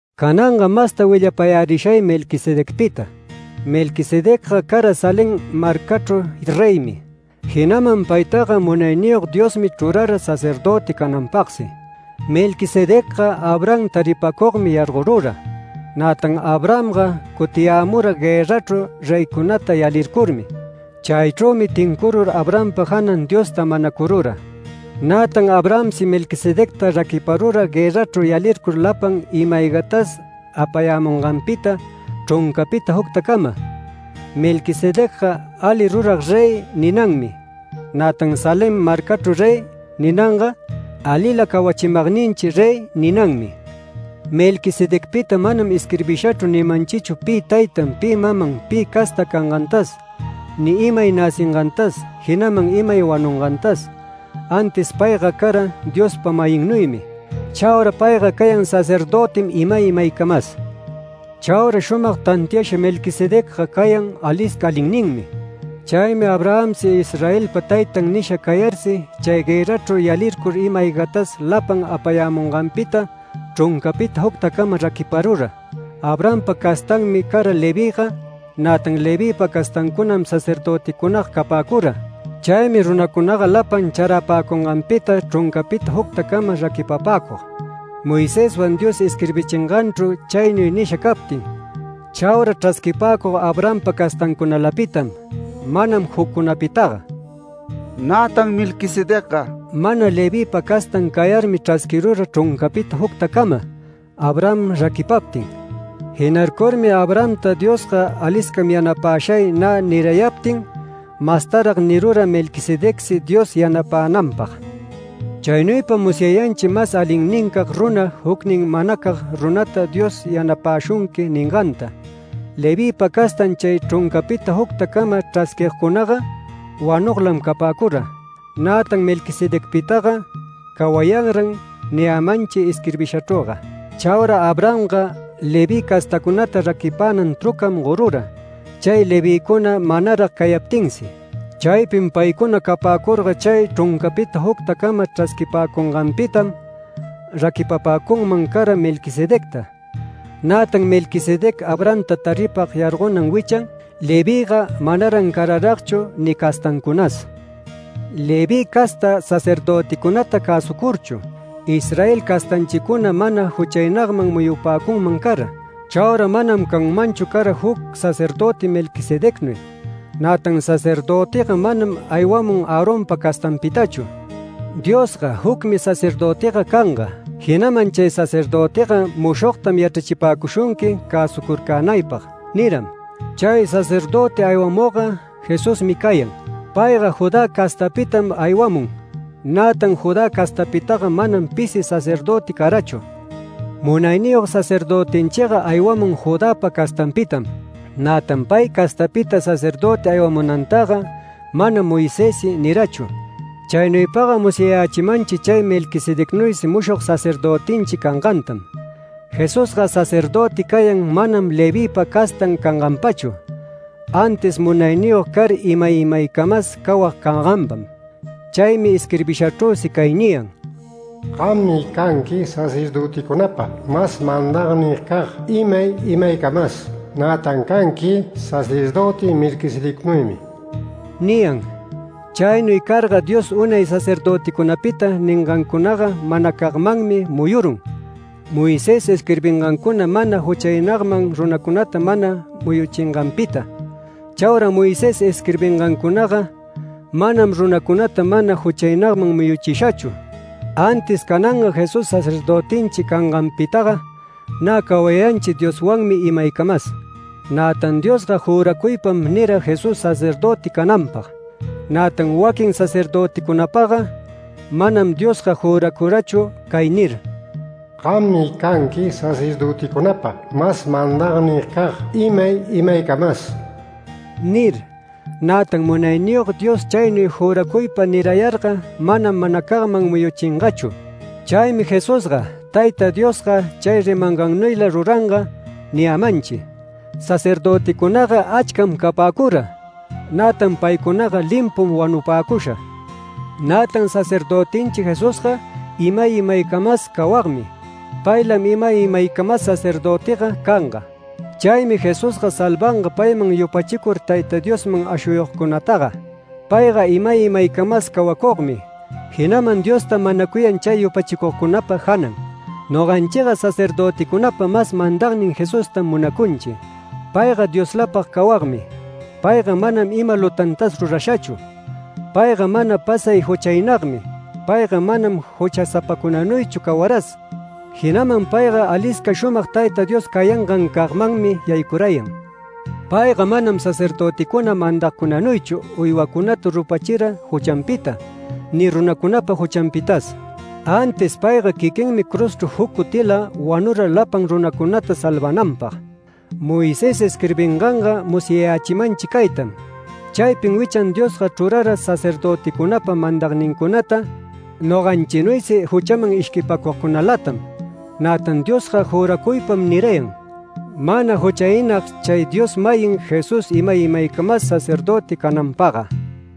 Cananga masta willapayärishay Melquisedecpita. Melquisedecga cara Salem marcachru reymi, jinaman paytaga Munayniyog Diosmi chrurara sacerdöti cananpagsi. Melquisedecga Abraham taripacugmi yargorura. Nätan Abrahamga cutiyämura guërrachru reycunata yalircurmi. Chaychrümi tincurur Abrahampa janan Diosta manacurura. Nätan Abrahamsi Melquisedecta raquiparura guërrachru yalircur lapan ima-aygatas apayämunganpita chruncapita juctacamam. Melquisedecga ‘Ali rurag rey’ ninanmi, nätan ‘Salem marcachru rey’ ninanga, ‘Alila cawachimagninchi rey’ ninanmi. Melquisedecpita manam isquirbishachru nimanchichu pi taytan, pi maman, pi casta cangantas, ni imay näcingantas, jinaman imay wanungantas, antis payga cara Diospa-mayinnuymi. Chaura payga cayan sacerdötim imay imaycamas. Chaura shumag tantiasha Melquisedecga cayan alisca alinninmi. Chaymi Abrahamsi Israelpa taytan nisha cayarsi chay guërrachru yalircur ima-aygatas lapan apayämunganpita chruncapita juctacama raquiparura. Abrahampa castanmi cara Levïga, nätan Levïpa castancunam sacerdöticunaga capäcura. Chaymi runacunaga lapan charapäcunganpita chruncapita juctacama raquipapäcug Moiseswan Dios isquirbichinganchru chaynuy nisha captin. Chaura chrasquipäcug Abrahampa castancunalapitam, manam juccunapitaga. Nätan Melquisedecga mana Levïpa castan cayarmi chrasquirura chruncapita juctacama Abraham raquipaptin. Jinarcurmi Abrahamta Diosga “Aliscam yanapashay” nä nirayaptin, mastarag nirura Melquisedecsi Dios yanapänanpag. Chaynuypam musyayanchi mas alinnincag runa, jucnin manacag runata “Dios yanapäshunqui” ninganta. Levïpa castan chay chruncapita juctacama chrasquigcunaga wanuglam capäcura. Nätan Melquisedecpitaga “Cawayanran” niyämanchim isquirbishachrüga. Chaura Abrahamga Leví castacunata raquipänan trucam gorura, chay Levïcuna manarag cayaptinsi. Chaypin paycuna capäcurga chay chruncapita juctacama chrasquipäcunganpitam raquipapäcunman cara Melquisedecta. Nätan Melquisedec Abrahamta taripag yargonan wichan Levïga manaran cararagchu ni castancunas. Leví casta sacerdöticunata cäsucurchu, Israel castanchicuna mana juchaynagman muyupäcunman cara. Chaura manam canmanchu cara juc sacerdöti Melquisedecnuy. Nätan sacerdötiga manam aywamun Aaronpa castanpitachu. Diosga “Jucmi sacerdötiga canga, jinaman chay sacerdötiga mushogtam yachrachipäcushunqui cäsucurcänaypag” niram. Chay sacerdöti aywamugga Jesusmi cayan. Payga Judá castapitam aywamun, nätan Judá castapitaga manam pisi sacerdöti carachu. Munayniyog sacerdötinchiga aywamun Judäpa castanpitam, nätan pay castapita sacerdöti aywamunantaga manam Moisessi nirachu. Chaynuypaga musyayächimanchi chay Melquisedecnuysi mushog sacerdötinchi cangantam. Jesusga sacerdöti cayan manam Levïpa castan canganpachu, antis munayniyog car imay imaycamas cawag canganpam. Chaymi isquirbishachrüsi cay niyan: “Gammi canqui sacerdöticunapa mas mandagnincag imay imaycamas, nätan canqui sacerdöti Melquisedecnuymi” niyan. Chaynuy carga Dios unay sacerdöticunapita ningancunaga manacagmanmi muyurun. Moisés isquirbingancuna mana juchaynagman runacunata mana muyuchinganpita. Chaura Moisés isquirbingancunaga manam runacunata mana juchaynagman muyuchishachu. Antis cananga Jesús sacerdötinchi canganpitaga nä cawayanchi Dioswanmi imaycamas. Nätan Diosga juracuypam nira Jesús sacerdöti cananpag. Nätan waquin sacerdöticunapagga manam Diosga juracurachu cay nir: “Gammi canqui sacerdöticunapa mas mandagnincag imay imaycamas” nir. Nätan Munayniyog Dios chaynuy juracuypa nirayarga manam manacagman muyuchingachu. Chaymi Jesusga “Tayta Diosga chay rimangannuylam ruranga” niyämanchi. Sacerdöticunaga achcam capäcura, nätan paycunaga limpum wanupäcusha. Nätan sacerdötinchi Jesusga imay imaycamas cawagmi. Paylam imay imaycamas sacerdötiga canga. Chaymi Jesusga salvanga payman yupachicur Tayta Diosman ashuyugcunataga. Payga imay imaycamas cawacugmi, jinaman Diostam manacuyan chay yupachicugcunapa janan. Noganchiga sacerdöticunapa mas mandagnin Jesustam munacunchi. Payga Dioslapag cawagmi. Payga manam ima lutantas rurashachu. Payga mana pasay juchaynagmi, payga manam juchasapacunanuychu cawaras. Jinaman payga alisca shumag Tayta Dios cayangancagmanmi yaycurayan. Payga manam sacerdöticuna mandagcunanuychu uywacunata rupachira juchanpita, ni runacunapa juchanpitas. Antis payga quiquinmi cruzchru juc cutila wanura lapan runacunata salvananpag. Moisés isquirbinganga musyachimanchi caytam: Chaypin wichan Diosga chrurara sacerdöticunapa mandagnincunata noganchinuysi juchaman ishquipäcugcunalatam, nätan Diosga juracuypam nirayan, mana juchaynag chay Dios-mayin Jesús imay imaycamas sacerdöti cananpagga.